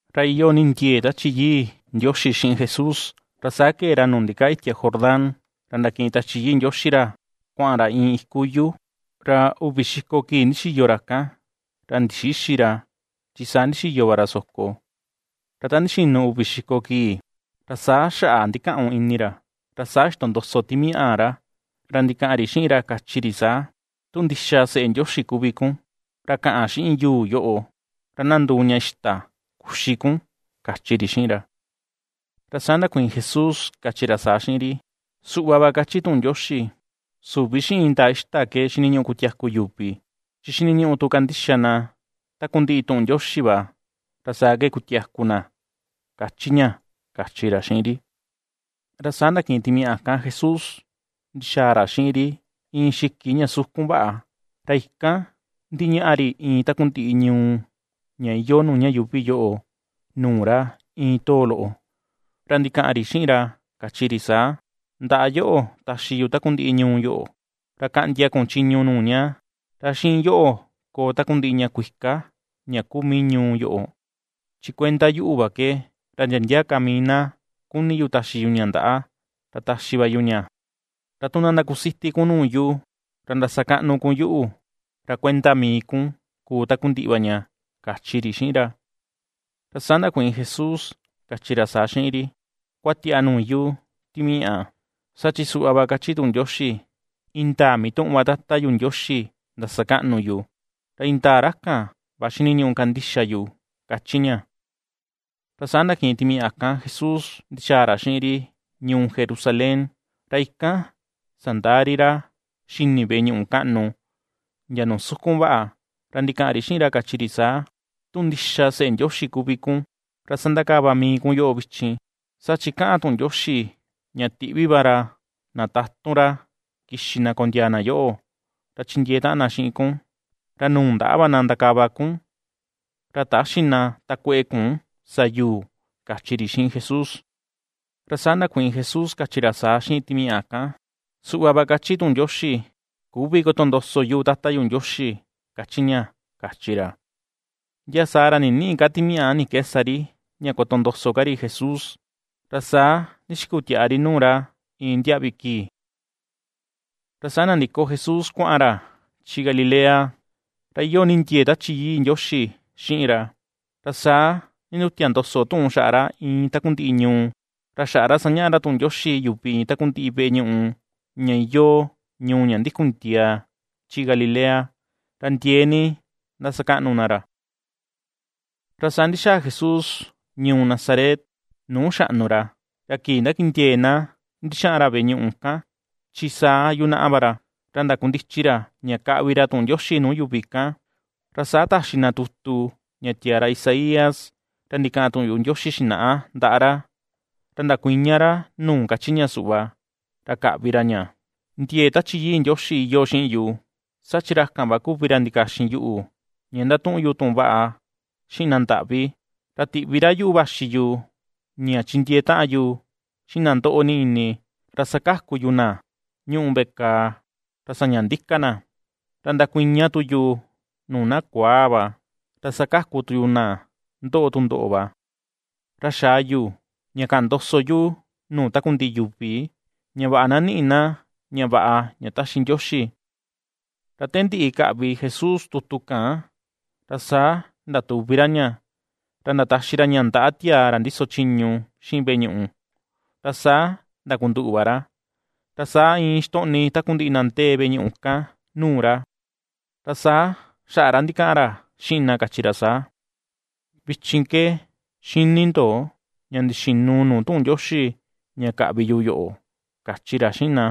Ra iyoo ni ndie̱e̱ Tachi Yii Ndioxi xiꞌin Jesús, ra saa ke̱e ra nuu ndikaa itia Jordán, ra ndakiꞌin Tachi Yii Ndioxi ra kuaꞌan ra iin iku yuu. Ra uvi xiko kii ndixiyo ra kan. Ra ndixïxi ra, chi saa ndixiyo va ra soko; ra ta ndixinu uvi xiko kii, ra saa xaꞌa ndikaꞌun ini ra. Ra saa ixtondoso timiaꞌa ra. Ra ndikaꞌan ri xiꞌin ra kachi ri saa: ―Tu ndixa Seꞌe Ndioxi kuvi kun, ra kaꞌan xiꞌin yuu yoꞌo ra na nduu ña ixta kuxi kun ―kachi ri xiꞌin ra. Ra saa ndakuiin Jesús, kachi ra saa xiꞌin ri: ―Suꞌva va kachi tuꞌun Ndioxi: “Süvi xiꞌin indaa ixta ke xiniñuꞌu kutiaku yuvi chi xiniñuꞌu tu kandixa na takundiꞌi tuꞌun Ndioxi va ra saa ke kutiaku na” ―kachi ña, kachi ra xiꞌin ri. Ra saa ndakiꞌin timiaꞌa kan Jesús ndixaa ra xiꞌin ri iin xiki ña sukun vaꞌa, ra ikan ndiñaꞌa ri iin takundiꞌi ñuu ña iyoo nuu ña yuuvi yoꞌo nuu ra iin too loꞌo. Ra ndikaꞌan ri xiꞌin ra, kachi ri saa: ―Ndaꞌa yoꞌo taxi yu takundiꞌi ñuu yoꞌo, ra kaꞌndia kun chiñu nuu ña, ra xiꞌin yoꞌo koo takundiꞌi ña kuika ña kuu mii ñuu yoꞌo. Chi kuenda yuꞌu va ke, ra ndia ndia ka mii na kuni yu taxi yu ña ndaꞌa, ra taxi va yu ña. Ra tu na ndakusiti kun nuu yu, ra ndasakaꞌnu kun yuꞌu, ra kuenda mii kun kuu takundiꞌi va ña ―kachi ri xiꞌin ra. Ra saa ndakuiin Jesús kachi ra saa xiꞌin ri: ―¡Kuatiaꞌa nuu yu, Timiaꞌa! Saa chi suꞌva va kachi tuꞌun Ndioxi: “Indaa mituꞌun va Tata yu Ndioxi ndasakaꞌnu yu, ra indaa ra kan va xiniñuꞌu kandixa yu” ―kachi ña. Ra saa ndakiꞌin timiaꞌa kan Jesús ndixaa ra xiꞌin ri ñuu Jerusalén. Ra ikan sandaa ri ra xini veꞌe ñuꞌu kaꞌnu, ndia nuu sukun vaꞌa. Ra ndikaꞌan ri xiꞌin ra, kachi ri saa: ―Tu ndixa Seꞌe Ndioxi kuvi kun, ra sandakava mii kun yoꞌo vichin. Saa chi kaꞌan tuꞌun Ndioxi: Ña tiꞌvi va ra na tatun ra kixi na kondiaa na yoꞌo ra chindiee taꞌan na xiꞌin kun. Ra nuu ndaꞌa va na ndakava kun. Ra täxi na takueꞌe kun sa yuu ―kachi ri xiꞌin Jesús. Ra saa ndakuiin Jesús kachi ra saa xiꞌin timiaꞌa kan: ―Suꞌva va kachi tuꞌun Ndioxi: “Küvi kotondoso yu Tata yu Ndioxi”, kachi ña ―kachi ra. Ndia saa ra ninïꞌi ka timiaꞌa ni ke sa ri ña kotondoso ka ri Jesús. Ra saa ndixikutiaꞌa ri nuu ra iin ndiaꞌvi kii. Ra saa nandiko Jesús kuaꞌan ra chi Galilea, ra iyoo ni ndiee Tachi Yii Ndioxi xiꞌin ra, ra saa ndindutia ndoso tuꞌun xaꞌa ra iin takundiꞌi ñuu. Ra xaꞌa ra sañaꞌa ra tuꞌun Ndioxi yuvi iin takundiꞌi veꞌe ñuꞌu ña iyoo ñuu ña ndikun ndiaa chi Galilea. Ra ndiee ni ^ndasakaꞌnu na ra. Ra saa ndixaa Jesús ñuu Nazaret nuu xaꞌnu ra. Ra kii ndakindiee̱ na ndixaꞌan ra veꞌe ñuꞌu kan, chi saa yunaꞌa va ra. Ra ndakundichi ra ña kaꞌvi ra tuꞌun Ndioxi nuu yuvi kan. Ra saa taxi na tutu ña tiaa ra Isaías ra ndikaꞌan tuꞌun yuꞌu Ndioxi xinaꞌa ndaꞌa ra. Ra ndakuiña ra nuu kachi ña suꞌva, ra kaꞌvi ra ña: Ndie̱e̱ Tachi Yii Ndioxi iyoo xiꞌin yu. Saa chi ra kan va kuvi ra ndikaxin yuꞌu ña ndatuꞌun yu tuꞌun vaꞌa xiꞌin na ndaꞌvi, ra tiꞌvi ra yuꞌu vaxi yu ña chindiee taꞌan yu xiꞌin na ndoꞌo ni ini, ra sakaku yu na ñuꞌu veꞌe kàà ra saña ndika na, ra ndakuiña tu yu nuu na kuaa va, ra sakaku tu yu na ndoꞌo tundoꞌo va. Ra xaa yu ña kaꞌan ndoso yu nuu takundiꞌi yuvi, ña vaꞌa na niꞌi na ña vaꞌa ña taxi Ndioxi. Ra te ndiꞌi kaꞌvi Jesús tutu kan, ra saa ndatuvi ra ña, ra ndataxi ra ña ndaꞌa tiaa ra ndiso chiñu xiꞌin veꞌe ñuꞌu, ra saa ndakunduꞌu va ra. Ra saa iin ixtoꞌni takundiꞌi na ndee veꞌe ñuꞌu kan nuu ra. Ra saa xaꞌa ra ndikaꞌan ra xiꞌin na kachi ra saa: ―Vichin ke ^xini ndo ña ndixinu nuu tuꞌun Ndioxi ña kaꞌvi yu yoꞌo ―kachi ra xiꞌin na.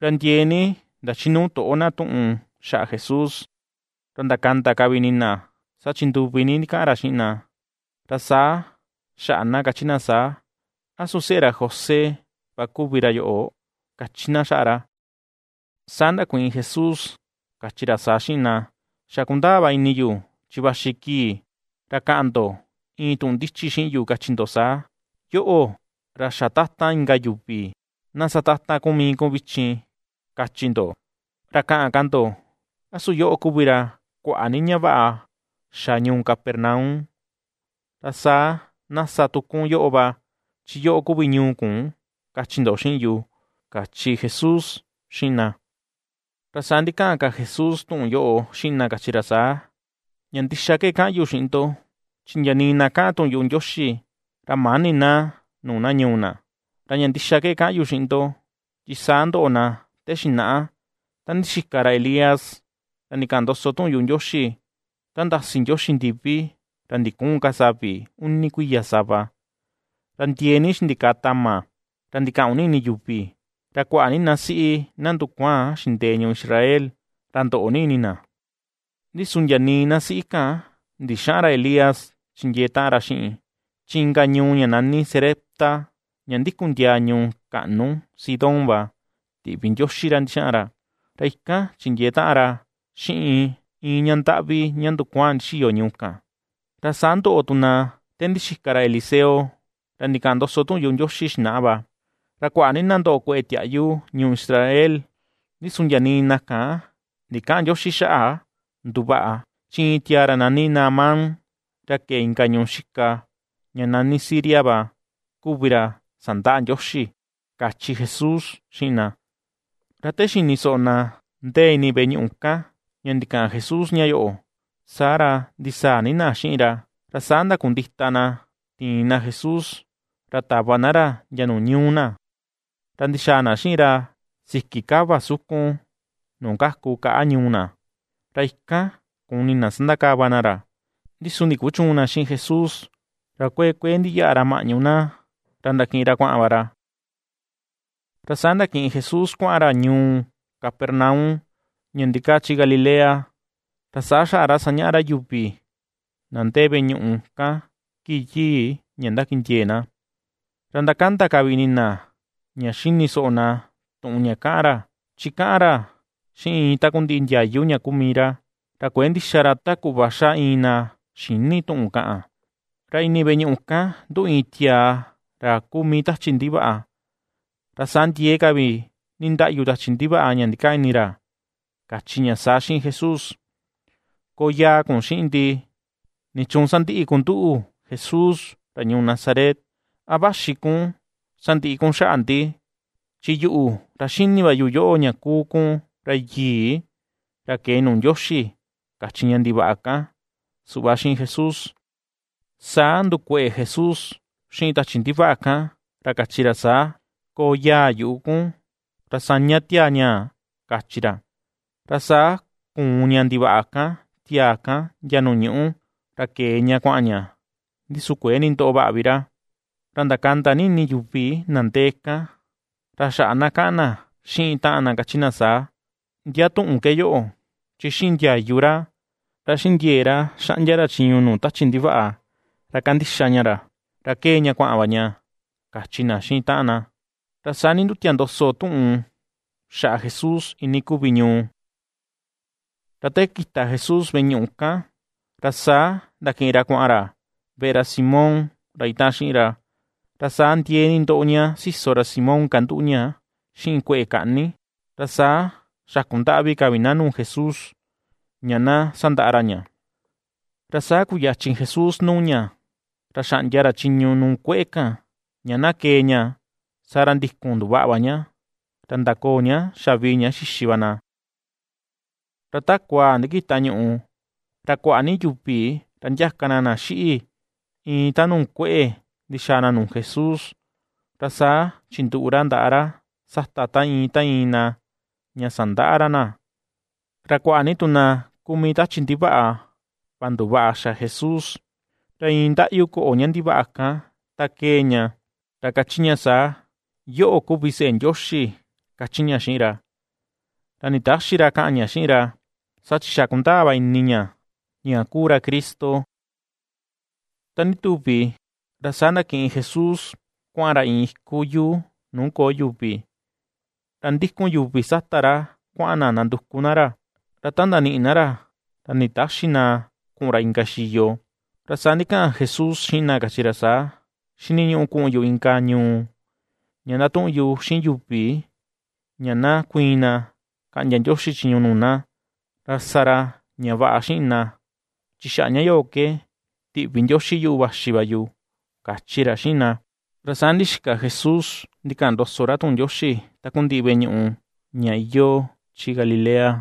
Ra ndiee ni ndachinuu toꞌo na tuꞌun xaꞌa Jesús. Ra ndakanda ka vi ini na, saa chi nduvi ni ndikaꞌan ra xiꞌin na. Ra saa xaꞌa na kachi na saa: ―¿A su seꞌe ra José va kuvi ra yoꞌo? ―kachi na xaꞌa ra. Saa ndakuiin Jesús kachi ra saa xiꞌin na: ―Xa kundaa va ini yu chi vaxi kii ra kaꞌan ndo iin tuꞌun ndichi xiꞌin yu, kachi ndo saa: “Yoꞌo, ra xa tatan inka yuvi, na sa tatan kun mii kun vichin”, kachi ndo. Ra kaꞌan ka ndo: “A su yoꞌo kuvi ra kuaꞌa ni ña vaꞌa xa ñuu Capernaum; ra saa na sa tu kun yoꞌo va, chi yoꞌo kuvi ñuu kun”, kachi ndo xiꞌin yu ―kachi Jesús xiꞌin na. Ra saa ndikaꞌan ka Jesús tuꞌun yoꞌo xiꞌin na kachi ra saa: ―Ña ndixa ke kaꞌan yu xiꞌin ndo, chi ndia nii na kaꞌan tuꞌun yuꞌu Ndioxi ra mäni na nuu na ñuu na. Ra ña ndixa ke kaꞌan yu xiꞌin ndo, chi saa ndoꞌo na te xinaꞌa ta ndixika ra Elías, ra ndikaꞌan ndoso tuꞌun yuꞌu Ndioxi: ta ndasi Ndioxi ndivi ra ndiküun ka savi uni kuiya sava. Ra ndiee ni xindikaa tama ra ndikaꞌun ni ini yuvi, ra kuaꞌa ni na siꞌi na ndukuaan xindee ñuu Israel, ra ndoꞌo ni ini na. Ndi su ndia nii na siꞌi kan ndixäꞌan ra Elías chindiee taꞌan ra xiꞌin, chi inka ñuu ña nani Sarepta, ña ndikun ndiaa ñuu kaꞌnu Sidón va, tiꞌvi Ndioxi ra ndixaꞌan ra, ra ikan chindiee taꞌan ra xiꞌin iin ña ndaꞌvi ña ndukuaan ndixiyo ñuu kan. Ra saa ndoꞌo tu na te ndixika ra Eliseo, ra ndikaꞌan ndoso tuꞌun yuꞌu Ndioxi xinaꞌa va, ra kuaꞌa ni na ndoꞌo kue̱ꞌe̱ tiaꞌyu ñuu Israel. Ndi su ndia nii na kan ndikäꞌan Ndioxi xaꞌa nduvaꞌa, chi iin tiaa ra nani Naamán, ra ke̱e inka ñuu xika ña nani Siria va, kuvi ra sandaꞌa Ndioxi ―kachi Jesús xiꞌin na. Ra te xini soꞌo na ndee ini veꞌe ñuꞌu kan, ña ndikaꞌan Jesús ña yoꞌo, saa ra ndisaa ni na xiꞌin ra. Ra saa ndakundita na tiin na Jesús ra tava na ra ndia nuu ñuu na, ra ndixaa na xiꞌin ra siki kava sukun nuu kaku kaꞌa ñuu na, ra ikan kuni na sandakava na ra. Ndi su ndikuchüun na xiꞌin Jesús, ra kuee kuee ndiyaꞌa ra maꞌñu na, ra ndakiꞌin ra kuaꞌan va ra. Ra saa ndakiꞌin Jesús kuaꞌan ra ñuu Capernaum ña ndikaa chi Galilea. Ra saa xaꞌa ra sañaꞌa ra yuvi na ndee veꞌe ñuꞌu kan kii yii ña ndakindiee na. Ra ^ndakanda ka vi ini na ña xini soꞌo na tuꞌun ña kaꞌan ra. Chi kaꞌan ra xiꞌin iin takundiꞌi ndiayu ña kuu mii ra, ra kuëe ndixa ra ta kuꞌva xa iin na xïni tuꞌun kaꞌan. Ra ini veꞌe ñuꞌu kan nduꞌu iin tiaa ra kuu mii tachi ndivaꞌa, ra saa ndiee ka vi ndindaꞌyu tachi ndivaꞌa ña ndikaa ini ra, kachi ña saa xiꞌin Jesús: ―Koo yaa kun xiꞌin ndi. ¿Nichuun sandiꞌi kun nduꞌu, Jesús, ra ñuu Nazaret? ¿A vaxi kun sandiꞌi kun xaꞌa ndi? Chi yuꞌu ra xini va yu yoꞌo, ña kuu kun Ra Yii, ra ke̱e nuu Ndioxi ―kachi ña ndivaꞌa kan suꞌva xiꞌin Jesús. Saa ndukueꞌe Jesús xiꞌin tachi ndivaꞌa kan, ra kachi ra saa: ―¡Koo yaa yuꞌu kun! Ra saña tiaa ñaa ―kachi ra. Ra saa kùùn ña ndivaꞌa kan tiaa kan ndia nuu ñuꞌu, ra ke̱e ña kuaꞌan ña, ndi su kuëe nindoꞌo vaꞌa vi ra. Ra ndakanda ni ini yuvi na ndee kan, ra xaꞌa na kaꞌan na xiꞌin taꞌan na kachi na saa: ―¿Ndia tuꞌun ke yoꞌo? Chi xiꞌin ndiayu ra, ra xiꞌin ndie̱e̱ ra xaꞌndia ra chiñu nuu tachi ndivaꞌa ra kandixa ña ra, ra kee ña kuaꞌan va ña ―kachi na xiꞌin taꞌan na. Ra saa nindutia ndoso tuꞌun xaꞌa Jesús iinii kuvi ñuu. Ra te kita Jesús veꞌe ñuꞌu kan, ra saa ndakiꞌin ra kuaꞌan ra veꞌe ra Simón ra itaꞌan xiꞌin ra. Ra saa ndiee ni ndoꞌo ña siso ra Simón kanduꞌu ña xiꞌin kueꞌe kaꞌni, ra saa xakundaꞌvi ka vi na nuu Jesús ña na sandaꞌa ra ña. Ra saa kuyachin Jesús nuu ña, ra xaꞌndia ra chiñu nuu kueꞌe kan, ña na kee ña; saa ra ndikun nduvaꞌa va ña; ra ndakoo ña xavii ña xixi va na. Ra ta kuaa ndikita ñuꞌu, ra kuaꞌa ni yuvi ra ndiaka na na xiꞌi, iin ta nuu kueꞌe, ndixaa na nuu Jesús; ra saa chinduꞌu ra ndaꞌa ra sata ta iin, ta iin na, ña sandaꞌa ra na. Ra kuaꞌa ni tu na kuu mii tachi ndivaꞌa, va nduvaꞌa xa Jesús, ra iin ndaꞌyu koꞌo ña ndivaꞌa kan ta kee ña, ra kachi ña saa: ―¡Yoꞌo, kuvi Seꞌe Ndioxi! ―kachi ña xiꞌin ra. Ra nditäxi ra kaꞌan ña xiꞌin ra, saa chi xa kundaa va ini ña, ña kuu ra Cristo. Ta ndituvi, ra saa ndakiꞌin Jesús kuaꞌan ra iin iku yuu nuu köo yuvi. Ra ndikun yuvi sata ra kuaꞌan na ndanduku na ra. Ra ta ndaniꞌi na ra ra nditäxi na kuꞌun ra inka xiyo. Ra saa ndikaꞌan Jesús xiꞌin na, kachi ra saa: ―Xiniñuꞌu kuꞌun yu inka ñuu ña ndatuꞌun yu xiꞌin yuvi ña na kuiin na kaꞌndia Ndioxi chiñu nuu na, ra sa ra ña vaꞌa xiꞌin na chi xaꞌa ña yoꞌo ke tiꞌvi Ndioxi yuꞌu vaxi va yu ―kachi ra xiꞌin na. Ra saa ndixika Jesús ndikaꞌan ndoso ra tuꞌun Ndioxi takundiꞌi veꞌe ñuꞌu ña iyoo chi Galilea.